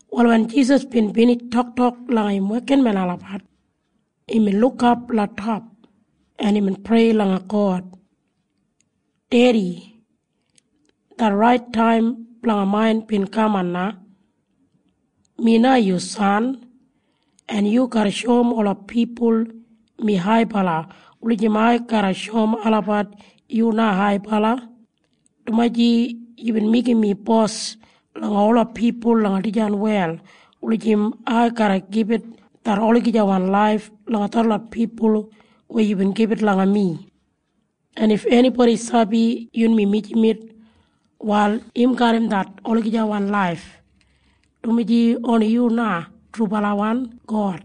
Wal wen Jisas bin binij toktok langa im wekinmen olabat, imbin lukap langa top, en imbin prei langa God, “Dedi, det rait taim blanga main bin kaman na. “Mi na yu san, en yu garra shoum ola pipul mi haibala wulijim ai garra shoum olabat yu na haibala, dumaji yubin meigim mi bos langa ola pipul langa dijan wel wulijim ai garra gibit det olagijawan laif langa detlot pipul weya yubin gibit langa mi. En if enibodi sabi yunmi mijamet, wal im garram det olagijawan laif, dumaji oni yu na trubalawan God,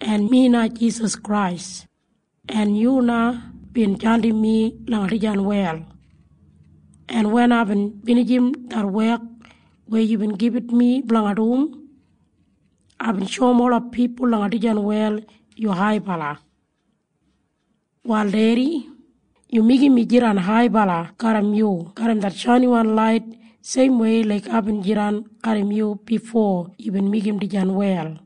en mi na Jisas Krais, en yu na bin jandim mi langa dijan wel. En wen aibin binijim det wek weya yubin gibit mi blanga dum, aibin shoum ola pipul langa dijan wel yu haibala. “Wal Dedi, yu meigim mi jidan haibala garram yu garram det shainiwan lait seimwei laik aibin jidan garram yu bifo yubin meigim dijan wel.”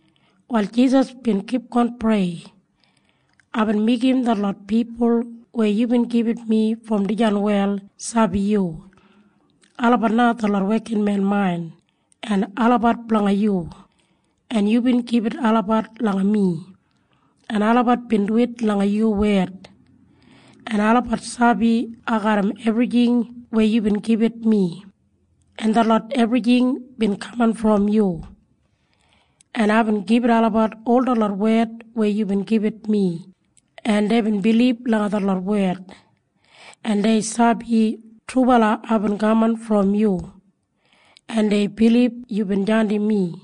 Wal Jisas bin kipgon prei, “Aibin meigim detlot pipul weya yubin gibit mi brom dijan wel sabi yu. Olabat na detlot wekinmen main, en olabat blanga yu, en yubin gibit olabat langa mi, en olabat bin duwit langa yu wed, en olabat sabi ai garram ebrijing weya yubin gibit mi, en detlot ebrijing bin kaman brom yu. En aibin gibit olabat ol detlot wed weya yubin gibit mi, en deibin bilib langa detlot wed, en dei sabi trubala aibin kaman brom yu, en dei bilib yubin jandim mi.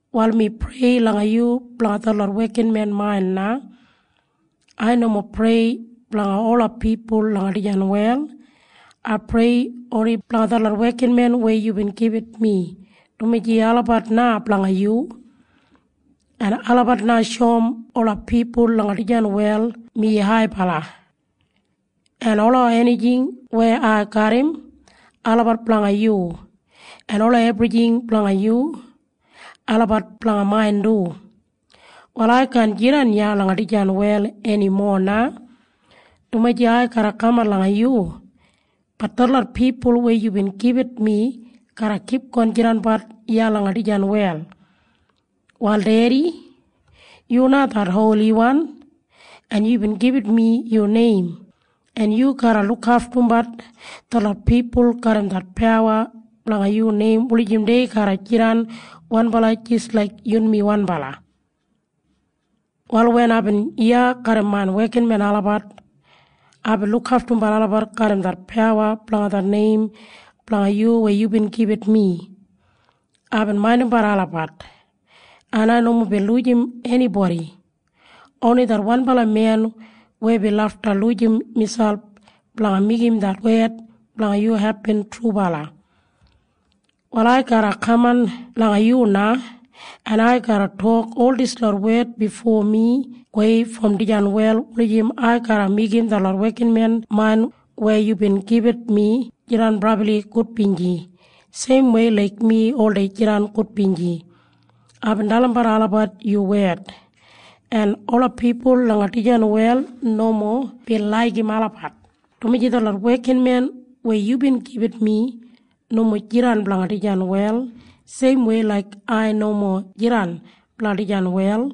“Wal mi prei langa yu blanga detlot wekinmen main na. Ai nomo prei blanga ola pipul langa dijan wel. Ai prei oni blanga detlot wekinmen weya yubin gibit mi, dumaji olabat na blanga yu. En olabat na shoum ola pipul langa dijan wel mi haibala. En ola enijing weya ai garram, olabat blanga yu. En ola ebrijing blanga yu, olabat blanga main du. “Wal ai kaan jidan iya langa dijan wel enimo na, dumaji ai garra kaman langa yu. Bat detlot pipul weya yubin gibit mi garra kipgon jidanbat iya langa dijan wel. “Wal Dedi, yu na det Holiwan, en yubin gibit mi yu neim, en yu garra lukaftumbat detlot pipul garram det pawa blanga yu neim wulijim dei garra jidan wanbala jis laik yunmi wanbala. “Wal wen aibin iya garram main wekinmen olabat, aibin lukaftumbat olabat garram det pawa blanga det neim blanga yu weya yubin gibit mi. Aibin maindimbat olabat, en ai nomo bin lujim enibodi. Oni det wanbala men weya bin lafta lujim miselp blanga meigim det wed blanga yu hepin trubala. “Wal ai garra kaman langa yu na, en ai garra tok ol dislot wed bifo mi gowei brom dijan wel wulijim ai garra meigim detlot wekinmen main weya yubin gibit mi jidan brabli gudbinji seimwei laik mi oldei jidan gudbinji. Aibin dalimbat olabat yu wed, en ola pipul langa dijan wel nomo bin laigim olabat, dumaji detlot wekinmen weya yubin gibit mi nomo jidan blanga dijan wel seimwei laik ai nomo jidan blanga dijan wel.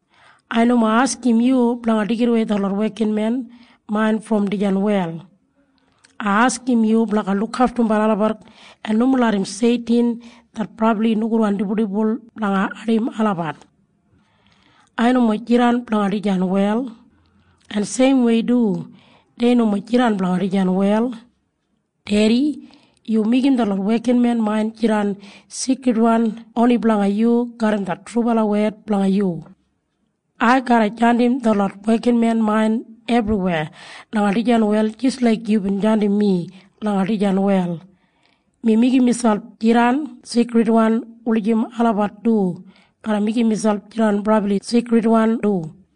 “Ai nomo askim yu blanga deigidawei detlot wekinmen main brom dijan wel. Ai askim yu blanga lukaftumbat olabat en nomo larram Seitin det brabli nogudwan dibuldibul blanga ardim olabat. “Ai nomo jidan blanga dijan wel, en seimwei du dei nomo jidan blanga dijan wel. “Dedi, yu meigim detlot wekinmen main jidan seikridwan oni blanga yu garram det trubala wed blanga yu. “Ai garra jandim detlot wekinmen main ebriweya langa dijan wel jis laik yubin jandim mi langa dijan wel. Mi meigim miselp jidan seikridwan wulijim olabat du garra meigim miselp jidan brabli seikridwan du.”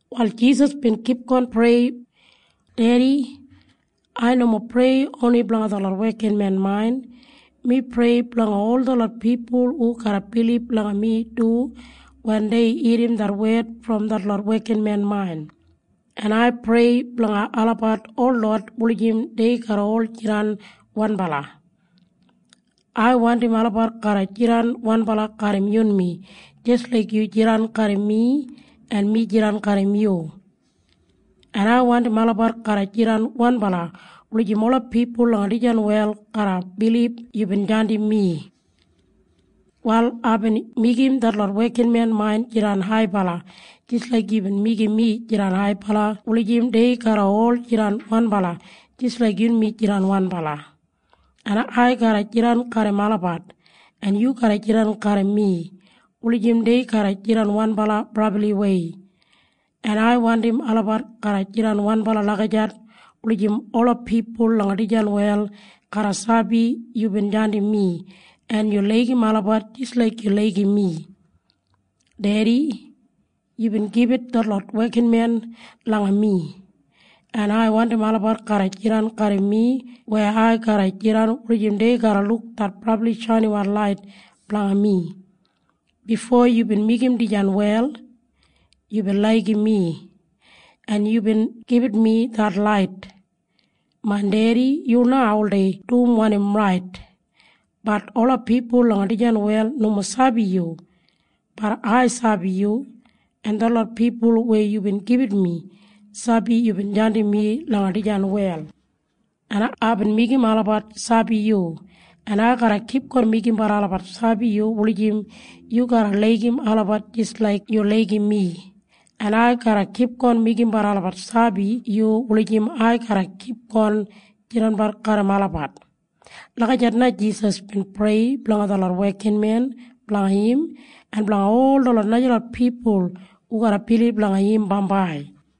Wal Jisas bin kipgon prei, “Dedi, ai nomo prei oni blanga detlot wekinmen main. Mi prei blanga ol detlot pipul hu garra bilib langa mi du wen dei irrim det wed brom detlot wekinmen main. En ai prei blanga olabat holot wulijim dei garra ol jidan wanbala. Ai wandim olabat garra jidan wanbala garram yunmi jis laik yu jidan garram mi en mi jidan garram yu. En ai wandim olabat garra jidan wanbala wulijim ola pipul langa dijan wel garra bilib yubin jandim mi. “Wal aibin meigim detlot wekinmen main jidan haibala jis laik yubin meigim mi jidan haibala wulijim dei garra ol jidan wanbala jis laik yunmi jidan wanbala. En ai garra jidan garram olabat en yu garra jidan garram mi wulijim dei garra jidan wanbala brabliwei, en ai wandim olabat garra jidan wanbala lagijat wulijim ola pipul langa dijan wel garra sabi yubin jandim mi en yu laigim olabat jis laik yu laigim mi. “Dedi, yubin gibit detlot wekinmen langa mi, en ai wandim olabat garra jidan garram mi weya ai garra jidan wulijim dei garra luk det brabli shainiwan lait blanga mi. Bifo yubin meigim dijan wel, yubin laigim mi, en yubin gibit mi det lait. “Main Dedi, yu na oldei dum wanim rait. Bat ola pipul langa dijan wel nomo sabi yu. Bat ai sabi yu. En detlot pipul weya yubin gibit mi sabi yubin jandim mi langa dijan wel. En aibin meigim olabat sabi yu. En ai garra kipgon meigimbat olabat sabi yu wulijim yu garra laigim olabat jis laik yu laigim mi. En ai garra kipgon meigimbat olabat sabi yu wulijim ai garra kipgon jidanbat garram olabat.” Lagijat na Jisas bin prei blanga detlot wekinmen blanga im en blanga ol detlot najalot pipul hu garra bilib langa im bambai.